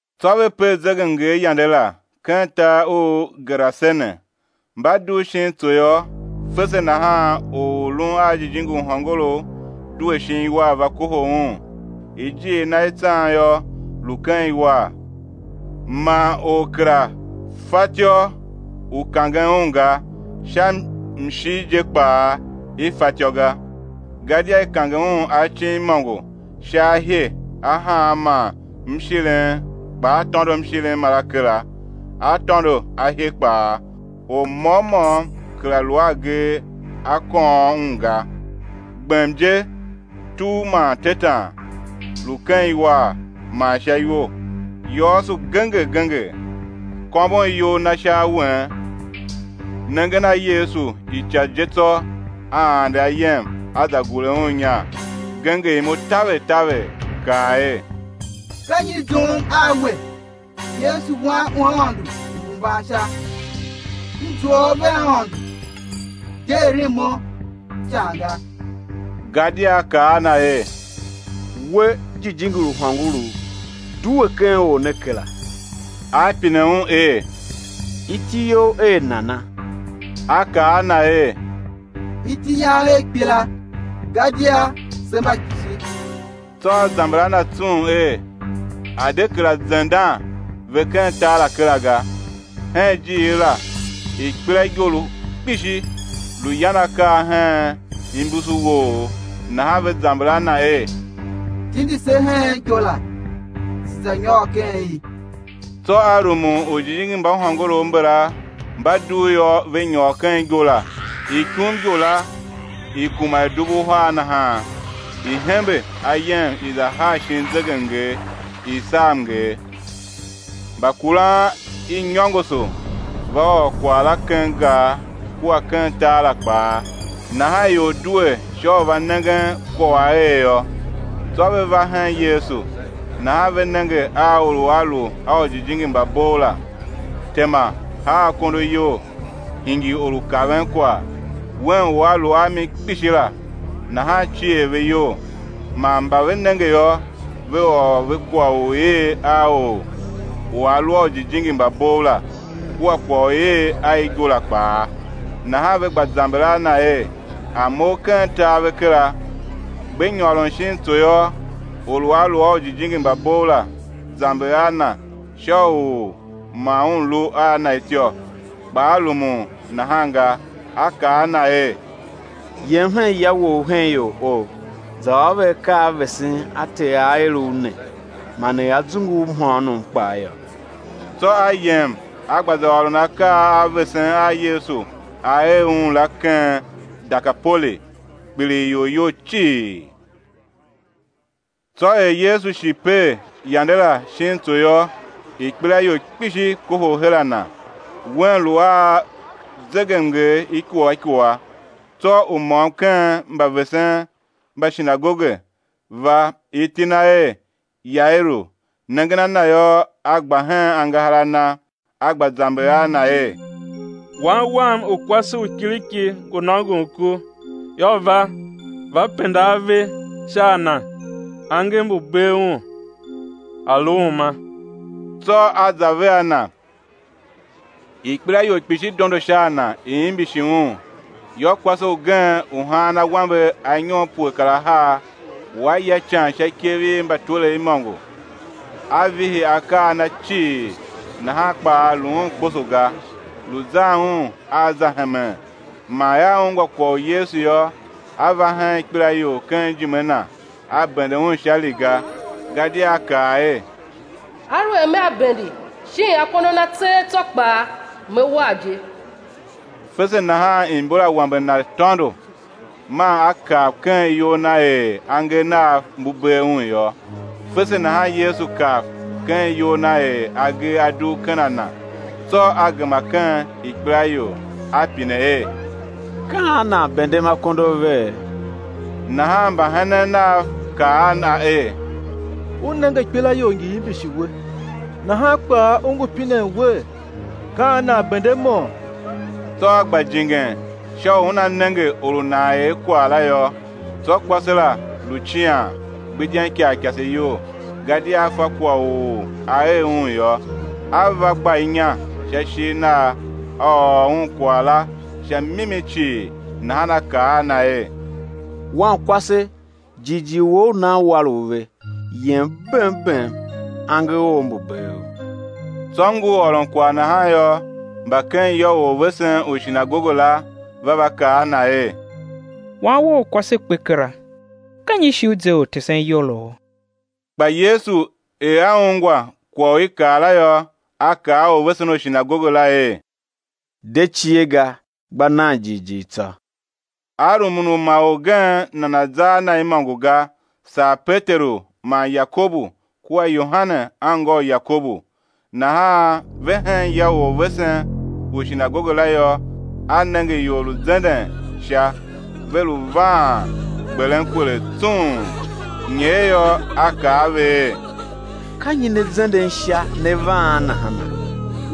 Tsô ve per zegemnger yande la, ken tar u Gerasene. Mba dugh shin tso yô, fese nahan or u lun a jijingi u hôngorough due shin iwar, va kohol Un; ijiir na i tsan yô, lu ken iwar, man or kera fatyô u kangen un ga, sha mshir je kpaa i fatyô ga. Gadia i kange un acin imôngo sha ahye a haan man mshirim, kpa a tôndo mshirim mara kera, a tôndo ahye kpaa, or môm môm kera lu a agee a kôôm un ga. Gbem je, tugh man tetan, lu ken iwar man sha iwo, yôôso genger genger, kômbon iyol na sha awen. Nengen a Yesu ica je tsô a ande ayem, a za gure Un inya, genger imo taver taver, kaa er: Ka nyi i zoughom a We, Yesu Wan u Aôndo Uhembansha? M zua U vea Aôndo, de eren mo ican ga. Gadia A kaa a na er: We, jijingi u hôngorough, due ken or ne kera. A pine un er: Iti you er ana? A kaa a Na er: Iti yam er ikpela, gadia se mba kpishi. Tsô a zamber a Na tsung er, A̱ de kera zendan ve ken tar la kera ga. Hen ijiir la ikpelaigo lu kpishi, lu yan akaa hen imbusuwoogh. Nahan ve zamber a Na er: Tindi se hen igo la, se̱ za nyôr ken i. Tsô A rumun. Ujijingi mba hôngorough mbala, mba dugh yô, ve nyôr ken igo la; ikumigo la, i kuma er dubu uhar nahan, i hembe ayem, i za haa shin zegemnger, i saa mnger. Mbakuran i nyôngoso va ôr kwagh la ken gar kua ken tar la kpaa. Nahan ior due sha u va nengen kwagh u a er yô. Tsô ve va hen Yesu, nahan ve nenge a or u a lu a ujijingi mba bov la, tema, haa akondo iyol, hingir or u kaven kwagh, wen u a lu a mi kpishi la. Nahan cier ve iyol. Man mba ve nenge yô, ve ôr ve kwagh u i er a or u a lu a ujijingi mba bov la, kua kwagh u i er a igo la kpaa. Nahan ve gba zamber a Na er, A̱ mough ken tar ve kera. Gbe nyôron shin tso yô, or u a lu a ujijingi mba bov la, zamber a Na sha u ma un lu a Na ityô. Kpa A rumun nahan ga, A kaa a na er: Yem hen ya wou hen ior ou, za ôr ve akaa a vesen a Ter A er u ne, man er A zungu u mhôônom kpaa yô. Tsô a yem a gba za ôron akaa a vesen a Yesu A er un la ken Dekapoli; kpiligh ior iyol cii. Tsô er Yesu shi per yande la shin tso yô, ikpelaior kpishi kohol her a Na. Un lu a zegemnger ikua ikua. Tsô u môm u ken mbavesen mba shinagoge va, iti na er Yairu, nengen a Na yô, a gba hen angahar a Na, a gba zamber a Na er: Wan wam u kwase u kiriki ngu nôngon ku. Yô, va, va penda ave sha a na, angev mbu̱ bee un a̱ lu uma. Tsô A za vea na. Ikpelaior kpishi dondo sha a Na, i imbishi Un. Yô, kwase ugen u haan awambe anyom pue kar ahar, u a ya ican sha ikev i mbatwerev imôngo, a vihi akaa a na cii, nahan kpaa lu un kposo ga, lu zan un a za hemen; man er a ungwa kwagh u Yesu yô, a va hen ikpelaior ken ijime Na, a bende Un sha riga; gadia a kaa er: Aluer mea bende shin akondo Na tseegh tsô kpaa, me war je. Fese nahan imbor i awambe na tôndo, man a kav ken iyol na er angev nav mbu bee un yô. Fese nahan Yesu kav ken iyol Na er agee a dugh ken a Na, tsô A gema ken ikpelaior, A pine er: Ka an nan bendem akondo avee? Nahan mbahenen Nav kaa a Na er: U nenge ikpelaior ngi imbishi We, nahan kpaa U ngu pinen Wer: Ka an nan bendemo? Tsô A gba jingen sha u Una nenge or u nan er kwagh la yô. Tsô kwase la lu cian, gbidyen ikarikase iyol gadia a fa kwagh u a er un yô, a va gba inya sha ishigh Nagh, a ôr Un kwagh la sha mimi cii. Nahan A kaa a na er: Wankwase, jighjigh wou u nan war u ve; yem bem bem, angev ou mbu̱ bee u. Tsô ngur ôron kwagh nahan yô, mba ken ya u orvesen u shinagoge la va, va kaa a na er: Wan wou u kwase kpe kera. Ka nyi shi u ze Ortesen iyolo? Kpa Yesu, er A ungwa kwagh u i kaa la yô, A kaa a orvesen u shinagoge la er: De cie ga, gba nan jighjigh tsô. A rumun u ma orgen nana̱ za a Na imôngo ga, saa Peteru man Yakobu kua Yohane anngô u Yakobu. Nahan ve hen ya u orvesen u shinagoge la yô, A nenge ior lu zenden sha, ve lu vaan gberen kwelegh tsung. Nyer yô, A kaa a ve er: Ka nyi ne zenden sha, ne vaan nahana?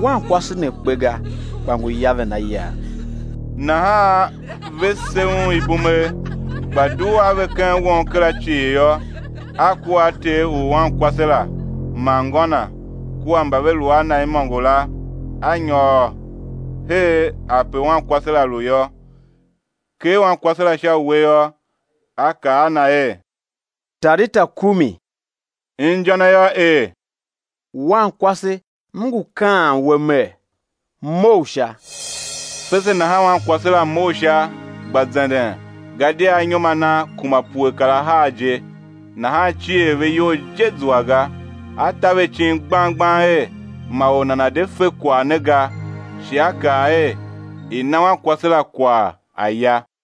Wankwase ne kpe ga, kpa ngu yaven a yav. Nahan ve se Un ibumegh. Kpa dugh a ve ken won kera cii yô, A kua a ter u wankwase la man ngô na kua mba ve lu a Na imôngo la, A nyôr her ape wankwase la lu yô. Ker wankwase sha uwe yô, A kaa a na er: Talita kumi! Inja na yô er: Wankwase, M ngu kaan we Mer, mough sha!. Fese nahan wankwase la mough sha, gba zenden; gadia anyom a na kuma pue kar ahar je. Nahan cier ve iyol je zua ga. A ta ve icin gbang gbang er, ma or nana̱ de fe kwagh ne ga, shi A kaa er, i̱ na wankwase la kwagh a̱ ya.